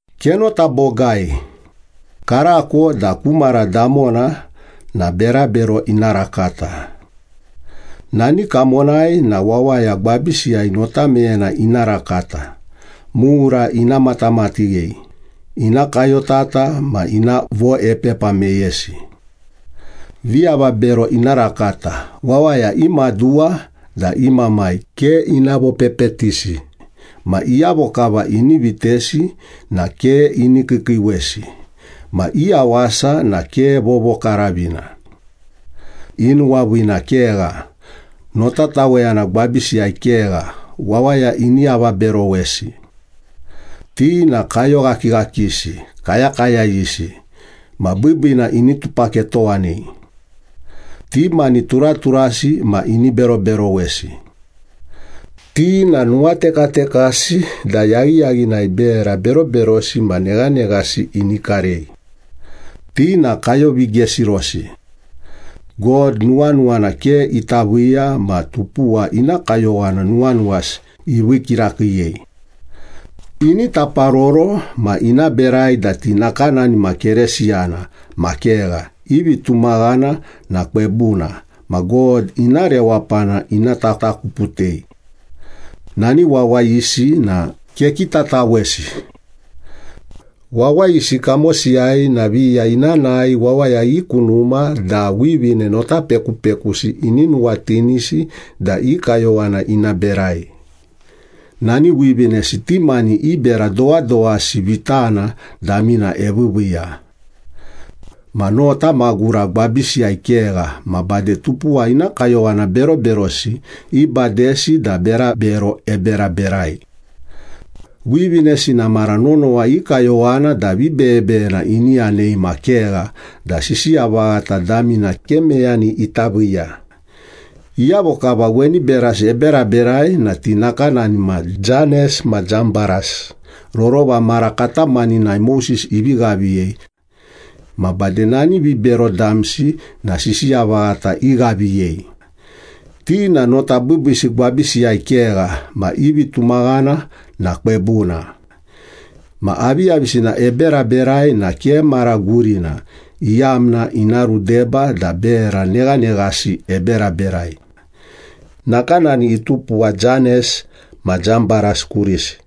Kenota bogai, karako da ku mara damona na berabero ina rakata. Nani kamonai na wawaya gwabisiyai notameyena ina rakata, mura ina matamatighei, ina kayotata ma ina voepepa meyesi. Viavabero ina rakata, wawaya i maduwa da i mamai ke ina vopepetisi, ma iyavo kava ini vitesi na ke ini kiikiiwesi, ma i yawasa na ke vovokaravina. I nuwaviina kegha, notatawena gwabisiyai kegha, wawaya ini avaberowesi. Ti na kayoghakighakisi, kayakayayisi, ma biibiina ini tupaketowanei. Ti mani turaturasi ma ini beroberowesi. Ti na nuwatekatekasi da yaghiyaghinai bera beroberosi ma neghaneghasi ini karei. Ti na kayovigesirosi. God nuwanuwana ke ita viiya ma tupuwa ina kayowana nuwanuwasi ivii kirakiiyei. Ini taparoro ma ina berai da ti nakanani ma Keresiyana ma kegha, i vitumaghana na kwebuna, ma God ina rewapana ina tatakuputei. Nani wawayisi na kekitatawesi. Wawayisi kamosiyai na viya ina nae wawaya i ku numa da wivine notapekupekusi ini nuwatinisi da i kayowana ina berai. Nani wivinesi ti mani i bera dowadowasi vitana damina eviiviiya. Ma nota magura gwabisiyai kegha ma bade tupuwa ina kayowana beroberosi ibadesi da berabero eberaberai. Wivinesi na mara nonowa i kayowana da vibeyebeyena ini yanei ma kegha da sisiya vaghata damina ke meyani ita viiya. Iyavo kava weni berasi eberaberai na ti nakanani ma Janes ma Jambaras, rorova mara katamaninai Moses ivi ghaviyei. Ma bade nani vibero damsi na sisiya vaghata ighaviyei. Ti na nota biibiisi gwabisiyai kegha ma i vitumaghana na kwebuna. Ma aviyavisina eberaberai na ke mara gurina, iyamna ina rudeba da bera neghaneghasi eberaberai. Nakanani itupuwa Janes ma Jambaras kurisi.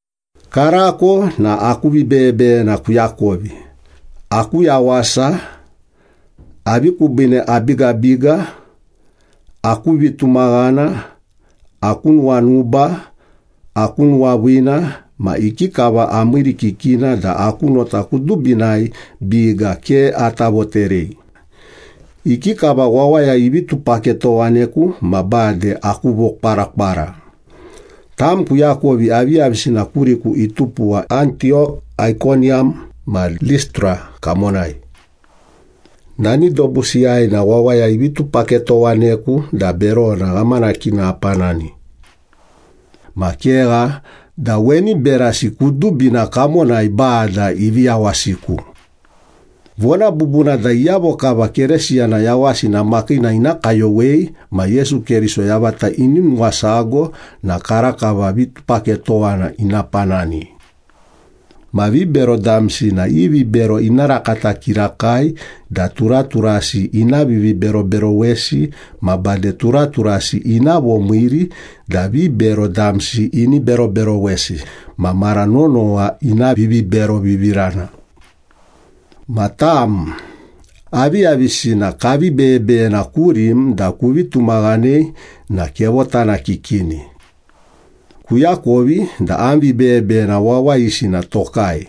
Karako na aku vibeyebeyena kuakovi, aku yawasa, avi kubiine abigabiga, aku vitumaghana, aku nuwanuba, aku nuwaviina, ma ikikava amiirikikina da aku nota kudubinai biga ke ata voterei, ikikava wawaya ivi tupaketowaneku ma bade aku vokwarakwara. Tam kuakovi aviyavisina kuriku itupuwa Antiyok, Aikoniyam ma Listra kamonai. Nani dobusiyai na wawaya ivi tupaketowaneku da berona ghamanakina apanani. Ma kegha da weni berasi kudubina kamonai Bada ivi yawasiku. Vona bubuna da iyavo kava Keresiyana yawasina makiina ina kayowei ma Yesu Keriso yavata ini nuwasago na karakava vitupaketowana ina panani. Ma vibero damsi na i vibero ina rakata kirakai da turaturasi ina viviberoberowesi ma bade turaturasi ina vomiiri da vibero damsi ini beroberowesi ma mara nonowa ina viviberovivirana. Ma tam, aviyavisina kavi beyebeyena kurim da kuvi tumaghanei na kevotanakikini. Kuakovi da am vibeyebeyena wawayisi na tokai.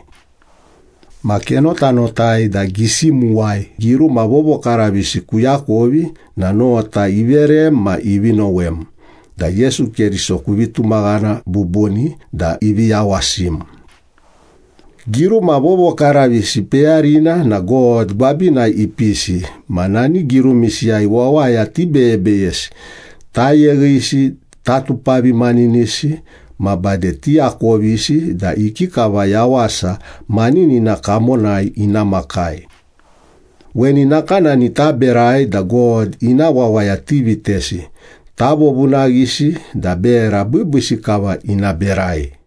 Ma kenotanotai da gisimuwai giruma vovokaravisi kuakovi na nota iverem ma ivi nowem da Yesu Keriso kuvi tumaghana bubuni da ivi yawasim. Giruma vovokaravisi peyarina na God gwabinai ipisi ma nani girumisiyai wawaya tibeyebeyesi, tayeghisi, tatupavimaninisi, ma bade tiakovisi da ikikava yawasa maninina kamonai ina makai. Weni nakanani taberai da God ina wawaya tivitesi, tavovunaghisi da bera biibiisi kava ina berai.